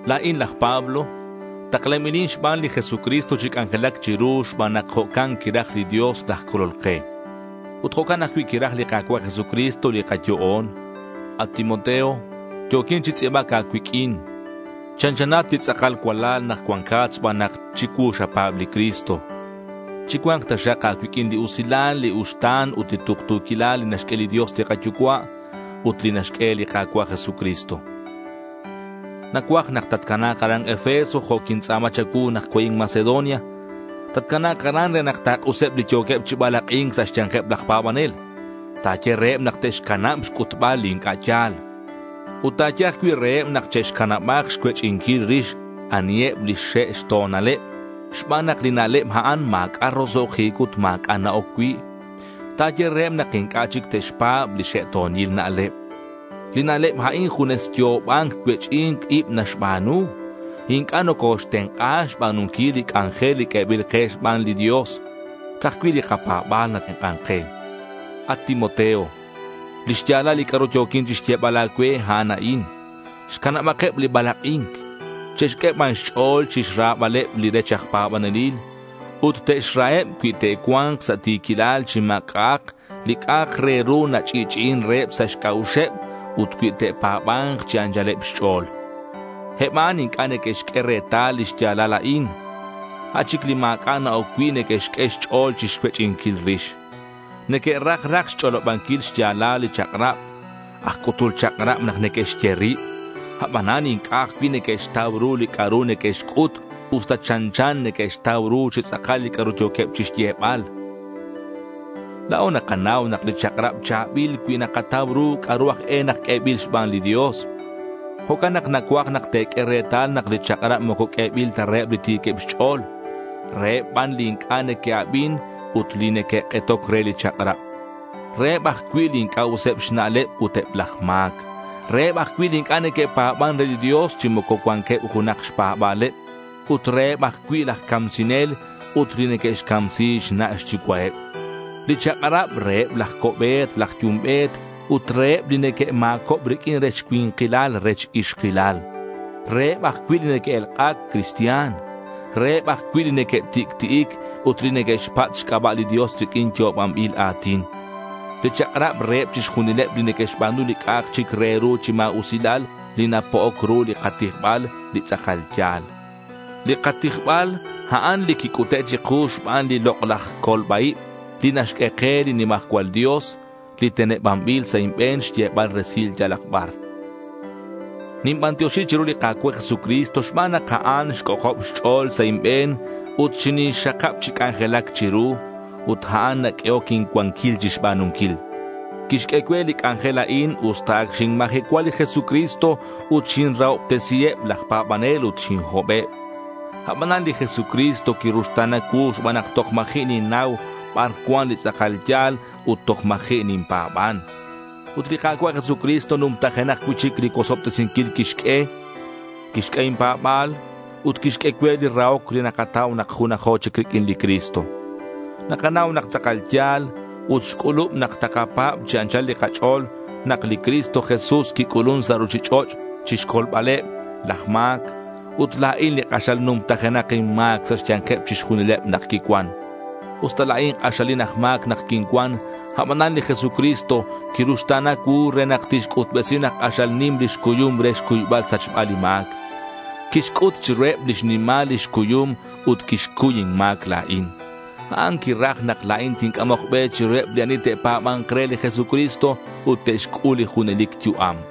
La̱in laj Pablo. Taklanbilin xban li Jesucristo chi c'anjelac chiru xban nak jo'can quiraj li Dios laj Colol ke. Ut jo'can ajcui' quiraj li Ka̱cua' Jesucristo li kayo'on. At Timoteo, yo̱quin chi tz'i̱bac a̱cuiq'uin. Chanchanat li tz'akal cualal nak cuancat xban nak chicuu xapa̱b li Cristo. Chicua̱nk taxak a̱cuiq'uin li usilal, li uxta̱n ut li tuktu̱quilal li naxq'ue li Dios li kaYucua' ut li naxq'ue li Ka̱cua' Jesucristo. Nacuaj nak tatcana̱k aran Efeso jo' quintz'a̱ma cha̱cuu nak co̱in Macedonia. Tatcana̱k aran re nak ta̱k'useb li yo̱queb chi balak'i̱nc sa' xya̱nkeb laj pa̱banel. Ta̱ye reheb nak te'xcanab xc'utbal li inc'a' ya̱l. Ut ta̱ye ajcui' reheb nak che'xcanabak xcuech'inquil rix aniheb lix xe' xto̱naleb xban nak li na'leb a'an ma̱c'a' roso'jic ut ma̱c'a' na-oc cui'. Ta̱ye reheb nak inc'a' chic te'xpa̱b li xe'to̱nil na'leb. Li na'leb a'in junes yo'oban cuech'i̱nc ib naxba̱nu. Inc'a' nocoxtenk'a xba̱nunquil li c'anjel q'uebil ke xban li Dios. Ca'aj cui' li kapa̱ba̱l natenk'an ke. At Timoteo, lix ya̱lal li c'a'ru yo̱quin chixyebal a̱cue, a'an a'in. Xcanabakeb li balak'i̱nc. Che'xq'ue ban xch'o̱l chixrabaleb li rech aj pa̱banelil. Ut te'xraheb cui te'cua̱nk sa' ti̱quilal chi ma̱c'a'ak li c'a'ak re ru nach'i'ch'i'in reheb sa' xc'a'uxeb ut cui te'pa̱ba̱nk chi anchaleb xch'o̱l. Eb a'an inc'a' neque'xq'ue retal li xya̱lal a'in. A' chic li ma̱c'a' na-oc cui' neque'xq'ue xch'o̱l chixcuech'inquil rix. Neque'raj raj xch'olobanquil xya̱lal li chak'rab. Aj c'utul chak'rab nak neque'xye rib. Abanan inc'a' ajcui' neque'xtau ru li c'a'ru neque'xc'ut usta chanchan neque'xtau ru chi tz'akal li c'a'ru yo̱queb chixyebal. La̱o nakanau nak li chak'rab cha̱bil cui nakatau ru c'a'ru aj e nak q'uebil xban li Dios. Jo'can nak nacuaj nak te̱q'ue retal nak li chak'rab moco q'uebil ta reheb li ti̱queb xch'o̱l. Reheb ban li inc'a' neque'abin ut li neque'k'etoc re li chak'rab. Reheb ajcui' li inc'a' useb xna'leb ut eb laj ma̱c. Reheb ajcui' li inc'a' neque'pa̱ban re li Dios chi moco cuanqueb junak xpa̱ba̱leb. Ut reheb ajcui' laj camsinel ut li neque'xcamsi xna' xyucua'eb. Li chak'rab reheb laj co'be̱t laj yumbe̱t ut reheb li neque'ma̱cob riq'uin rech cui̱nkilal rech ixkilal. Reheb ajcui' li neque'elk'ac cristian. Reheb ajcui' li neque'tic'ti'ic ut li neque'xpatz' xc'aba' li Dios riq'uin yo'obanbil a̱tin. Li chak'rab reheb chixjunileb li neque'xba̱nu li c'a'ak chic re ru chi ma̱usilal li napo'oc ru li katijbal li tz'akal ya̱l. Li katijbal a'an li quic'ute' chiku xban li lok'laj colba-ib li naxq'ue ke li nimajcual Dios, li tenebanbil sa' inbe̱n xyebal resilal yalak bar. Ninbantioxi chiru li Ka̱cua' Jesucristo xban nak a'an xc'ojob xch'o̱l sa' inbe̱n ut xinixxakab chi c'anjelac chiru. Ut a'an naq'uehoc incuanquil chixba̱nunquil. Quixq'ue cue li c'anjel a'in usta ac xinmajecua li Jesucristo ut xinrahobtesi eb laj pa̱banel ut xinhobeb. Abanan li Jesucristo quiruxta̱na cuu xban nak toj ma̱ji' ninnau bar cuan li tz'akal ya̱l ut toj ma̱ji' ninpa̱ban. Ut li Ka̱cua' Jesucristo numtajenak cui'chic li cuosobtesinquil quixq'ue. Quixq'ue inpa̱ba̱l ut quixq'ue cue li rahoc li nakatau nak junajo chic riq'uin li Cristo. Nakanau nak tz'akal ya̱l ut xc'ulub nak takapa̱b chi anchal li kach'o̱l nak li Cristo Jesús quic'ulun sa' ruchich'och' chixcolbaleb laj ma̱c. Ut la̱in li k'axal numtajenak inma̱c sa' xya̱nkeb chixjunileb nak quincuan. Usta la̱in k'axalin aj ma̱c nak quincuan, abanan li Jesucristo quiruxta̱na cuu re nak tixc'utbesi nak k'axal nim lix cuyum re xcuybal xsachbal li ma̱c. Quixc'ut chiruheb lix nimal lix cuyum nak quixcuy inma̱c la̱in. A'an quiraj nak la̱in tinc'amok be chiruheb li ani te'pa̱ba̱nk re li Jesucristo ut te'xc'ul li junelic yu'am.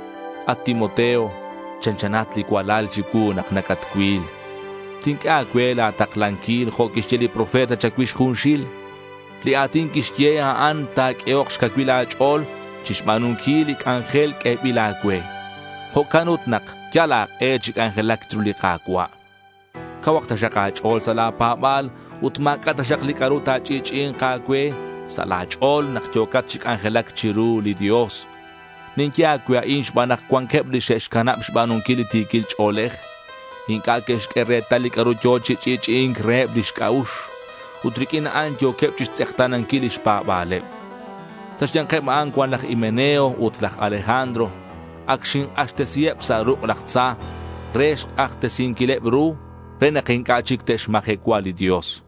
At Timoteo, chanchanat li cualal chicuu nak nacatcuil. Tinq'ue a̱cue la̱ taklanquil jo' que'xye li profeta cha̱cuix junxil. Li a̱tin que'xye, a'an ta̱q'uehok xcacuil a̱ch'o̱l chixba̱nunquil li c'anjel q'uebil a̱cue. Jo'can ut nak yal a̱k'e chi c'anjelac chiru li Ka̱cua'. Cauhak taxak a̱ch'o̱l sa' la̱ pa̱ba̱l ut ma̱c'a' taxak li c'a'ru ta̱ch'i'ch'i'i̱nk a̱cue sa' la̱ ch'o̱l nak yo̱cat chi c'anjelac chiru li Dios. Ninye a̱cue a'in xban nak cuanqueb li xe'xcanab xba̱nunquil li ti̱quil ch'o̱lej. Inc'a' que'xq'ue retal li c'a'ru yo̱ chi ch'i'ch'i'i̱nc reheb lix c'a'ux. Ut riq'uin a'an yo̱queb chixtz'ekta̱nanquil lix pa̱ba̱leb. Sa' xya̱nkeb a'an cuan laj Himeneo ut laj Alejandro. Ac xink'axtesiheb sa' ruk' laj tza re xc'ajtesinquileb ru re nak inc'a' chic te'xmajecua li Dios.